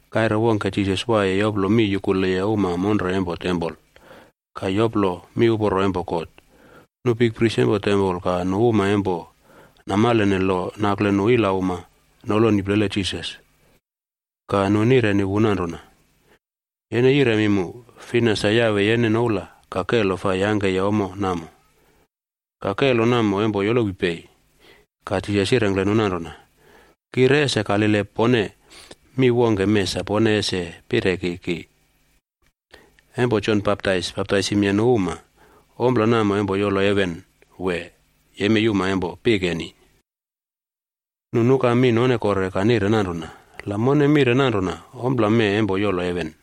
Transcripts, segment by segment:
Kaire wongke, Jisas waiye yoplo mi yukuleye uma monre empo tempol ka yoplo miuporo empo God, nu bikpris empo tempol ka nu uma empo namalene lo nakle nu ilauma noloni plele Jisas. Ka nu nireni wu nanrona, “Yene yiremi mu, fina sa yawe yene noula ka kelo fai yangkeye ommo namo? Ka kelo namo empo yolowi pei?” Ka Jisas yirengkle nu nanrona, “Ki re ese kalile pone mi wongke mee sa pone ese pireki ki. Empo Jon Baptais baptaisimye nu uma, ompla namo empo yolo heven wee, yemei uma empo pikeni?” Nu nuka mi none kore ka nire nanrona, “La mone mire nanrona, ‘Ompla mee empo yolo heven,’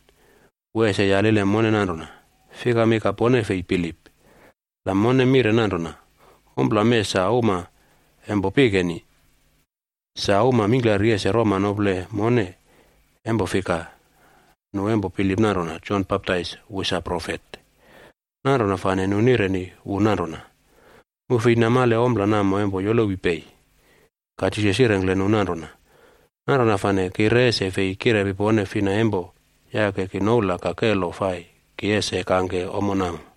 wu ese yalile mone nanrona, ‘Fikami ka pone fei bilip?’ La mone mire nanrona, ‘Ompla mee sa uma empo pikeni,’ sa uma mingklari ese roma nople mone, empo fika, nu empo bilip nanrona Jon Baptais wu sa profet.” Nanrona fane nu nireni wu nanrona, “Mu fei namale ompla namo empo yolowi pei.” Ka Jisas yirengkle nu nanrona, “Nanrona fane ki re ese fei kirepi pone fina empo yake ki noula ka kelo fai ki ese kangke ommo namo.”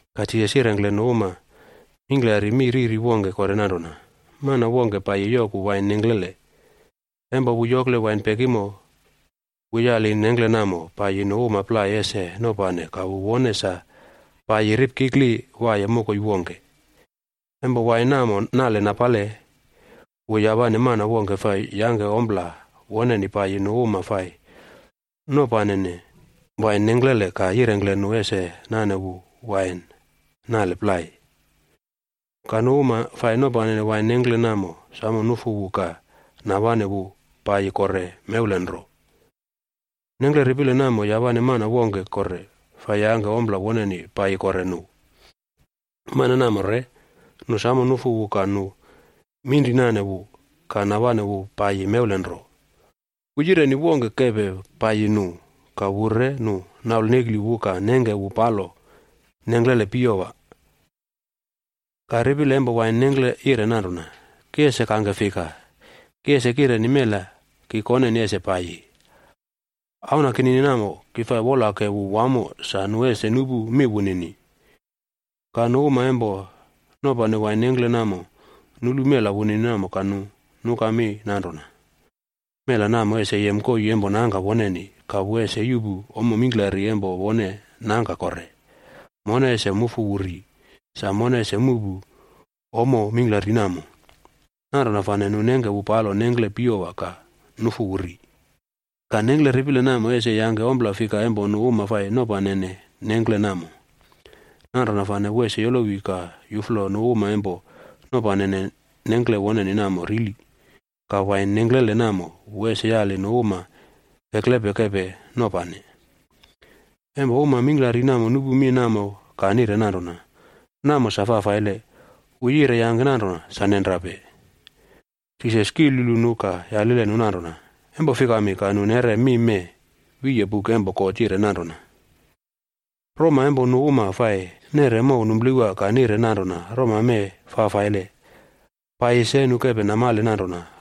Ka Jisas yirengkle uma mingklari mi riri wongke kore nanrona, “Mana wongke paiyi yoku wain nengklele. Empo wu yokle wain pekimo, wu yali nengkle namo paiyi nu uma plai ese nopane ka wu wone sa paiyi ripkikli waiye mokoi wongke. Empo wain namo nale napale, wu yawane mana wongke fai yangke ommo woneni paiyi nu uma fai nopanene wain nengklele ka yirengkle nu ese nane wu wain nale plai. Ka nu uma fai nopanene wain nengkle namo samo nufu wu ka nawane wu paiyi kore mewlen nro. Nengkle ripile namo yawane mana wongke kore fai yangke ompla woneni paiyi kore nu. Mana namo re nu samo nufu wu ka nu minrinane wu ka nawane wu paiyi mewlen nro. Wu yireni wongke kepe paiyi nu ka wu re nu naulnekli wu ka nengke wu palo nengklele piyowa. “Ka ripile empo wain nengkle yire nanrona, ‘Ki ese kangke fika? Ki ese kireni mela ki koneni ese paiyi. Auna kinini namo ki fai wolake wu wamo sa nu ese nupu mi wunini.’ “Ka nu uma empo nopane wain nengkle namo nulu mela wunini namo ka nu nuka mi nanrona, ‘Mela namo ese yem koii empo nangka woneni ka wu ese yuꞌpu ommo mingklari empo wone nangka kore. Mone ese mufu wu ri, sa mone ese muꞌpu ommo mingklari namo.’ Nanrona fane nu nengke wu palo wain nengkle piyowa ka nufu wu ri. “Ka nengkle ripile namo ese yangke ompla fika empo nu uma fai nopanene nengkle namo? Nanrona fane wu ese yolowi ka yuflo nu uma empo nopanene nengkle woneni namo rili, ka wain nengklele namo wu ese yali nu uma kekeple kepe nopane.” Empo uma mingklari namo nupu mi namo ka nire nanrona, “Namo sa fafaile! Wu yire yangke nanrona sa nenrape.” Jisas kilyulu nu ka yalile nu nanrona, “Empo fikami ka nu neꞌre mi mee wiye buk empo God yire nanrona, ‘Roma empo nu uma fai neꞌre mow numplewa ka nire nanrona, roma mee fafaile paiyi se nu kepe namale nanrona,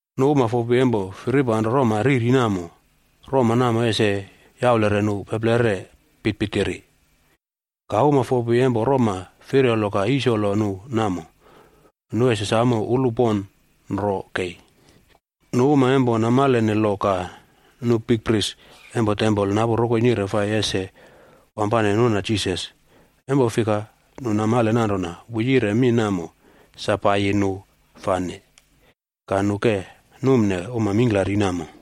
Nu uma fopi empo firipanro roma riri namo, roma namo ese yaulere nu peplere pitpitiri. Ka uma fopi empo roma firyolo ka yisolo nu namo, nu ese samo ulu pon ro kei.” Nu uma empo namalene lo ka nu bikpris empo tempol napu rokoi nire fai ese wampane nuna Jisas, empo fika nu namale nanrona wu yire mi riri namo sa paiyi nu fane. Ka nu ke numne uma mingklari namo.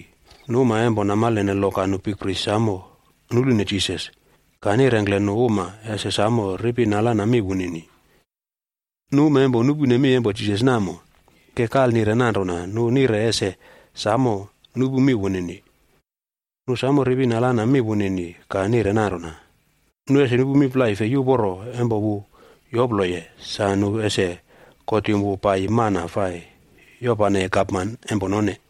Nu uma empo namalene lo ka nu bikpris samo nulune Jisas, ka nirengkle nu uma ese samo ripi nalana mi wunini. Nu uma empo nupune mi empo Jisas namo, ke kalnire nanrona nu nire ese samo nupu mi wunini. Nu samo ripi nalana mi wunini ka nire nanrona, nu ese nupu mi plai fei uporo empo wu yoploye, sa nu ese kotim wu paiyi mana fai yopaneye gapman empo none.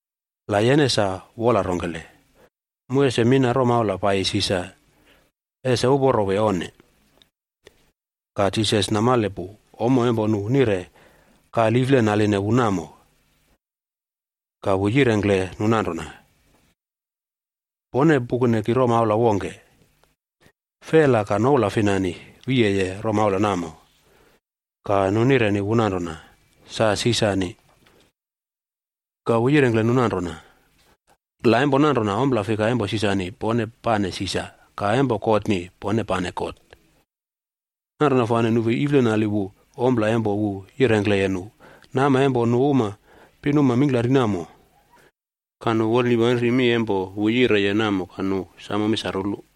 La yene sa wola rongkele, mu ese mina romaula paiyi Sisar ese uporo wee onne?” Ka Jisas namale pu ommo empo nu nire kaliflenaline wu namo, ka wu yirengkle nu nanrona, “Pone pukune ki romaula wongke. Fela ka noula finani, wiyeye romaula namo?” Ka nu nireni wu nanrona, “Sa Sisarni.” Ka wu yirengkle nu nanrona, “La empo nanrona, ompla fika empo Sisarni pone pane Sisar, ka empo Godni pone pane God.” Nanrona fane nu fei iflenali wu ompla empo wu yirengkleye nu, nama empo nu uma pinuma mingklari namo. Ka nu wolnipanri mi empo wu yireye namo ka nu samo mi sa rulu.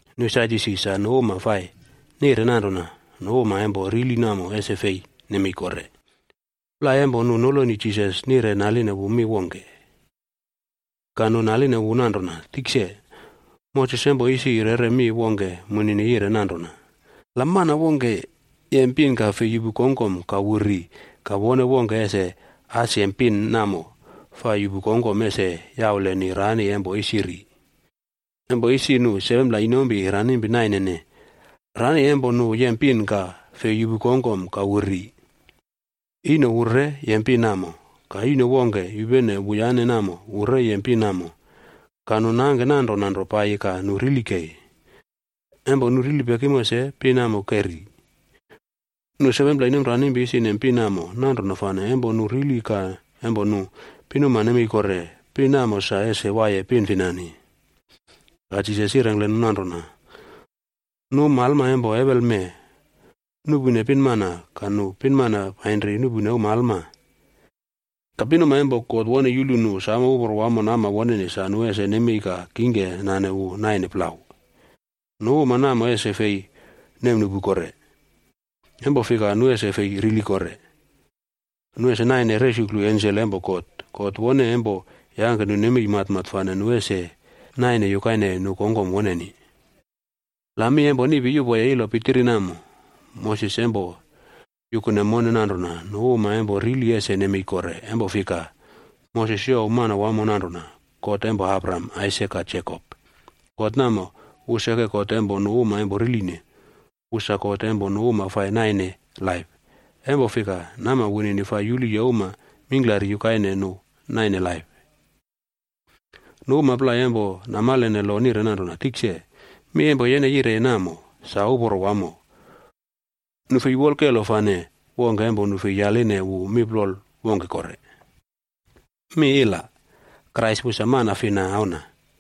Nu Sadyusi sa nu uma fai nire nanrona nu uma empo rili namo ese fei nemei kore. Plai empo nu noloni Jisas nire naline wu mi wongke. Ka nu naline wu nanrona, “Tikse, Moses empo isi yeꞌre mi wongke munini yire nanrona, ‘La mana wongke yem pin ka fei yuꞌpu kongkom ka wu ri, ka wone wongke ese as yem pin namo fai yuꞌpu kongkom ese yauleni rani empo isi ri.’ Empo isi nu 7pla inompi ranimpi nainene. Rani empo nu yem pin ka fei yuꞌpu kongkom ka wu ri. Ino wu re yem pin namo. Ka ino wongke yupene wuyane namo wu re yem pin namo, ka nu nangke nanrona nro paiyi ka nu rili kei. Empo nu rili pekimo se pin namo ke ri. Nu 7pla inomranimpi isi nem pin namo, nanrona fane empo nu rili ka empo nu pinuma nemei kore, pin namo sa ese waiye pin finani?” Ka Jisas yirengkle nu nanrona, “Nu uma alma empo ewelme nuꞌpune pinmana ka nu pinmana painri nuꞌpune uma alma. Ka pinuma empo God wone yulu nu samo uporo wamo nama woneni sa nu ese nemei kore ka kingke nane wu naine plau, nu uma namo ese fei nemnuꞌpu kore. Empo fika nu ese fei rili kore. Nu ese naine resuklu ensel empo God. God wone empo yangke nu nemei matmat fane nu ese naine yukaine nu kongkom woneni. La mi empo niꞌpi yuꞌpoye ilo pitiri namo, Moses empo yukune mone nanrona nu uma empo rili ese nemei kore, empo fika, Moses youw Manawamo nanrona, ‘God empo Abraham, God namo, wu seke God empo nu uma empo riline. Wu sa God empo nu uma fai naine laip, empo fika, nama wunini fai yuluye uma mingklari yukaine nu naine laip.” Nu uma plai empo namalene lo nire nanrona, “Tikse, mi empo yene yireye namo sa uporo wamo.” Nu fei wolkelo fane wongke empo nu fei yaline wu mi plol wongke kore. Krais wu sa mana fina auna?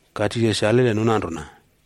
Ka Jisas yalile nu nanrona,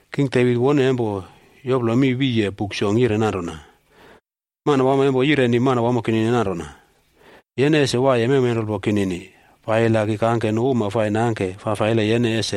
King Devit wone empo yoplo mi wiye Buk Song yire nanrona: ‘Manawamo empo yireni Manawamo kinini nanrona, “Yene ese waiye mewmenrulpo kinini, paiyi la ki kangke nu uma fai nangke fafaile yene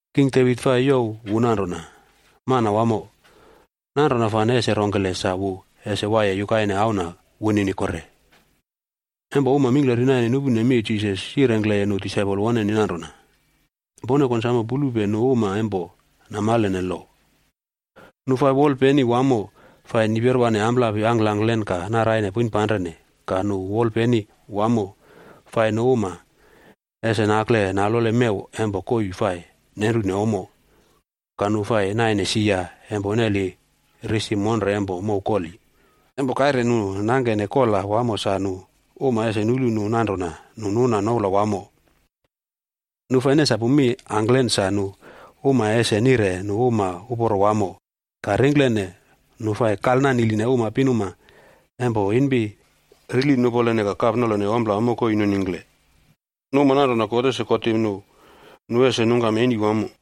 King Devit fai youw wu nanrona, ‘Manawamo.’ Nanrona fane ese rongkele sa wu ese waiye yukaine auna wunini kore?” Empo uma mingklari naine nupune mi, Jisas yirengkle nu disaipol woneni nanrona, “Pone konsamo pulupe nu uma empo namalene lo. Nu fai wolpeni wamo fai niperwane amplapi angkangklen, ka naraine poinpanrene ka nu wolpeni wamo fai nu uma ese nakle nalole mew empo koii fai nenrune ommo, ka nu fai naine sia empo neli risi monre empo mow koli, empo kaire nu nangkene kola wamo sa nu uma ese nulu nu nanrona nu nuna noula wamo. Nu fai nesapu mi angklen sa nu uma ese nire nu uma uporo wamo, ka ringklene nu fa kalnaniline uma pinuma empo inpi rili nupolene ka kapnolone ompla mokoi nuningkle. Nu uma nanrona, God ese kotim nu, nu ese nungkam eni wamo.”